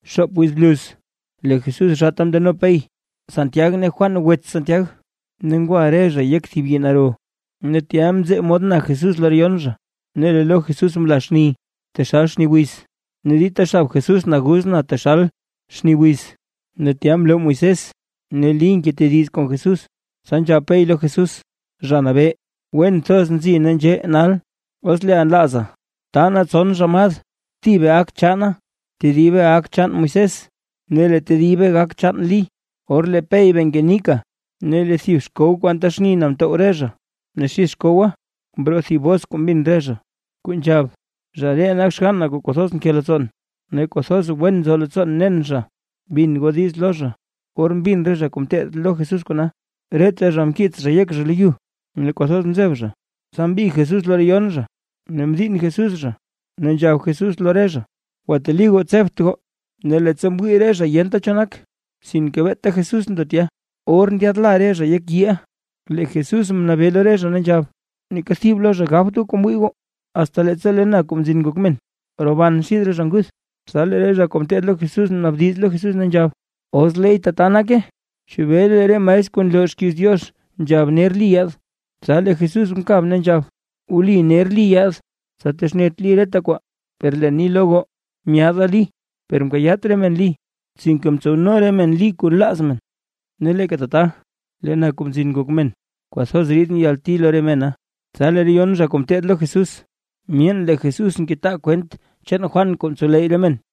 Xoop wiz bluz lee Jesús zhaata mndeno Pey, Santiag ne Juan wets Santiag, ne ngwa re zha yek thib yii naro. Ne tya mzee mod na Jesús lo re yon zha. Ne lee lo Jesús mla xni taxal xni wiz, ne dita xab Jesús naguz na taxal xni wiz. Ne tya mloo Moisés ne Lí ngetediz kon Jesús. Tsa nzhab Pey lo Jesús: ―Zha Nabee, ¡wen thoz nzi nee nzhee nal! Os leeʼa nlaaza, taa nee tson ramad, thibe gak chaana, tedibe gak chaan Moisés ne lee tedibe gak chaan Lí. Or lee Pey bee ngenika, lee thib xkow kuu anta xni na mtow re zha, ne xid xkowa mroo thib bos kuu mbin re zha, kuu nzhab: ―Zha ree nak xgann na kuu kwathoz nke leettsoon, ne kwathoz wen nzo leettsoon nen zha. Bin goo diiz lo zha. Or mbin re zha kuu ngeteed lo Jesús kona, reta zha mkiits zha yek zha lo yu, ne kwathoz mzeb zha. Tsa mbig Jesús lo re yon zha, ne mdiinn Jesús zha, ne nzhab Jesús lo re zha: ―Gwateli goo; tsebt goo. Ne leettsa mwii re zha yenta cho nak, sinke beeta Jesús ndo tya. Or ndyaadla re zha yek yiiʼa, lee Jesús mnabee lo re zha ne nzhab: ―Neeka thib lo zha gabt goo kuu mwii goo, asta leettsa lee na Kuu Mzin Ngok Men, roban xid re zha nguth. Tsa lee re zha kuu ngeteed lo Jesús mnaabdiz lo Jesús, ne nzhab: ―Os leey tata nake, ¿chebee lee re maestr kuu nloo xkiiz Diox nzhab, ner Lí yaad? Tsa lee Jesús mkab ne nzhab: ―Wli ner Lí yaad, tsa texnet Lí reta kwaa. Per leen ni lo goo, myaada Lí per mkayaat re men Lí, sinke mtsowno re men Lí kuu nlaaz men. Ne leeka tata lee na Kuu Mzin Ngok Men, kwathoz ridʼn yalti lo re mena. Tsa lee re yon zha kuu ngeteed lo Jesús, myeen lee Jesús ngetaa kwent chaan Juan kuu mtsowleyy re men.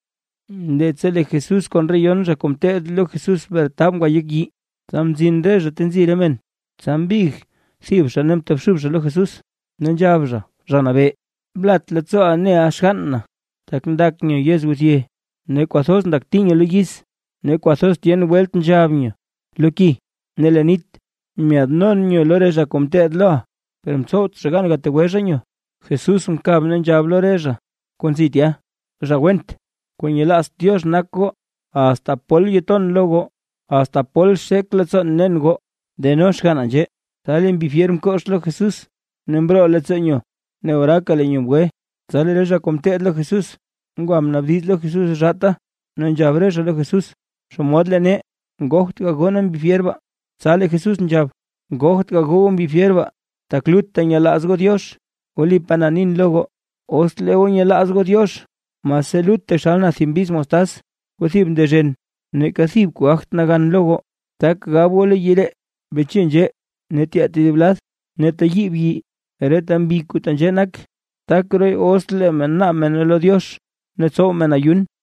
Leettsa lee Jesús kon re yon zha kuu ngeteed lo Jesús mretab ngwa yek yii, tsa mzin re zha ta nzi re men. Tsa mbig thib zha ne mtobxub zha lo Jesús, ne nzhab zha: ―Zha Nabee, blat leettsooʼa neʼa xgann na, tak ndak nyo yizguthye. Ne kwathoz ndakti nyo lo yiz; ne kwathoz tyen welt nzhab nyo lo ki ne leen nit. Myaadnon nyo lo re zha kuu ngeteed loʼa, per mtsowt zha gan gategwe zha nyo. Jesús mkab ne nzhab lo re zha kuu nzi tya: ―Zha went, kuu nyelaazt Diox nak goo. ¿Asta pol ton lo goo? ¿Asta pol xek leettsoon nen goo? Deno xganna nzhee. Tsa lee mbi fyer mkox lo Jesús ne mroo leettsoo nyo, ne oraaka lee nyo mgwe. Tsa lee re zha kuu ngeteed lo Jesús, ngwa mnaabdiz lo Jesús zhaata ne nzhab re zha lo Jesús: ―¿Xomod lee nee, ngogt gagoo nee mbi fyer baa? Tsa lee Jesús nzhab: ―Ngogt gagoo goo mbi fyer baa, tak lutta nyelaaz goo Diox. Wlipaa na nin lo goo, os lee goo nyelaaz goo Diox mase lut taxal na thib mbiz mostaz, kuu thib ndezhen, neeka thib kuu gagt nagan lo goo. Tak gab goo lo yii ree: “Beche nzhee ne tyee tedib lad”, ne teyiib yii. Reta mbi kuu tenzhee nak, tak rooy os lee men naab mene lo Diox ne tsow men ayun.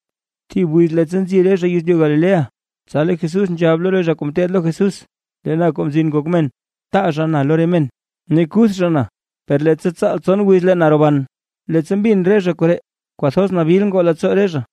Thib wiz leettsa nzi re zha yezlyu Galilea, tsa lee Jesús nzhab lo re zha kuu ngeteed lo Jesús: ―Lee na Kuu Mzin Ngok Men, taa zha na lo re men, ne kuth zha na, per leettsa tsaal tson wiz lee na roban. Leettsa mbin re zha koree, kwathoz nabil ngoo leettsoo re zha.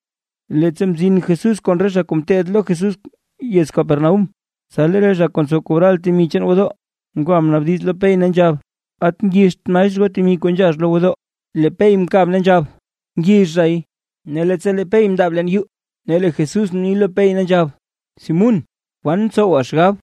Leettsa mzin Jesús kon re zha kuu ngeteed lo Jesús yez Capernaúm, tsa lee re zha kuu ntsow kobral temi chaan gwodoo, ngwa mnaabdiz lo Pey ne nzhab: ―¿At ngixt maestr goo temi kuu nzhax lo gwodoo? Lee Pey mkab ne nzhab: ―Ngix zhay. Ne leettsa lee Pey mndaab leen yuu, lee Jesús mni lo Pey ne nzhab: ―¿Simún, kwan ntsowa xgab?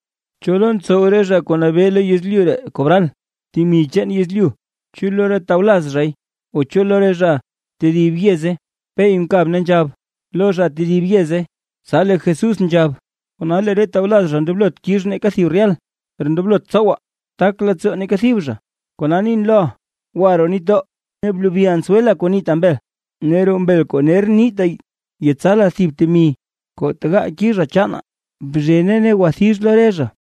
¿Cho lo ntsow re zha kuu nabee lo yezlyu ree kobral temi chaan yezlyu? ¿Chu lo re tawlaz zhay o chu lo re zha tedib yeze? Pey mkab ne nzhab: ―Lo zha tedib yeze. Tsa lee Jesús nzhab: ―Kona lee re tawlaz zha ndoblot kix neeka thib rehal. Per ndoblot tsowaa, tak leettsoo neeka thib zha. Kona nin loʼa, gwa roo nitdoo, ne blebi answel kuu niita mbel. Ne roo mbel kuu ner niita yetsala thib temi kuu tegaa kizha chaanaa. Bzhene ne gwathix lo re zha.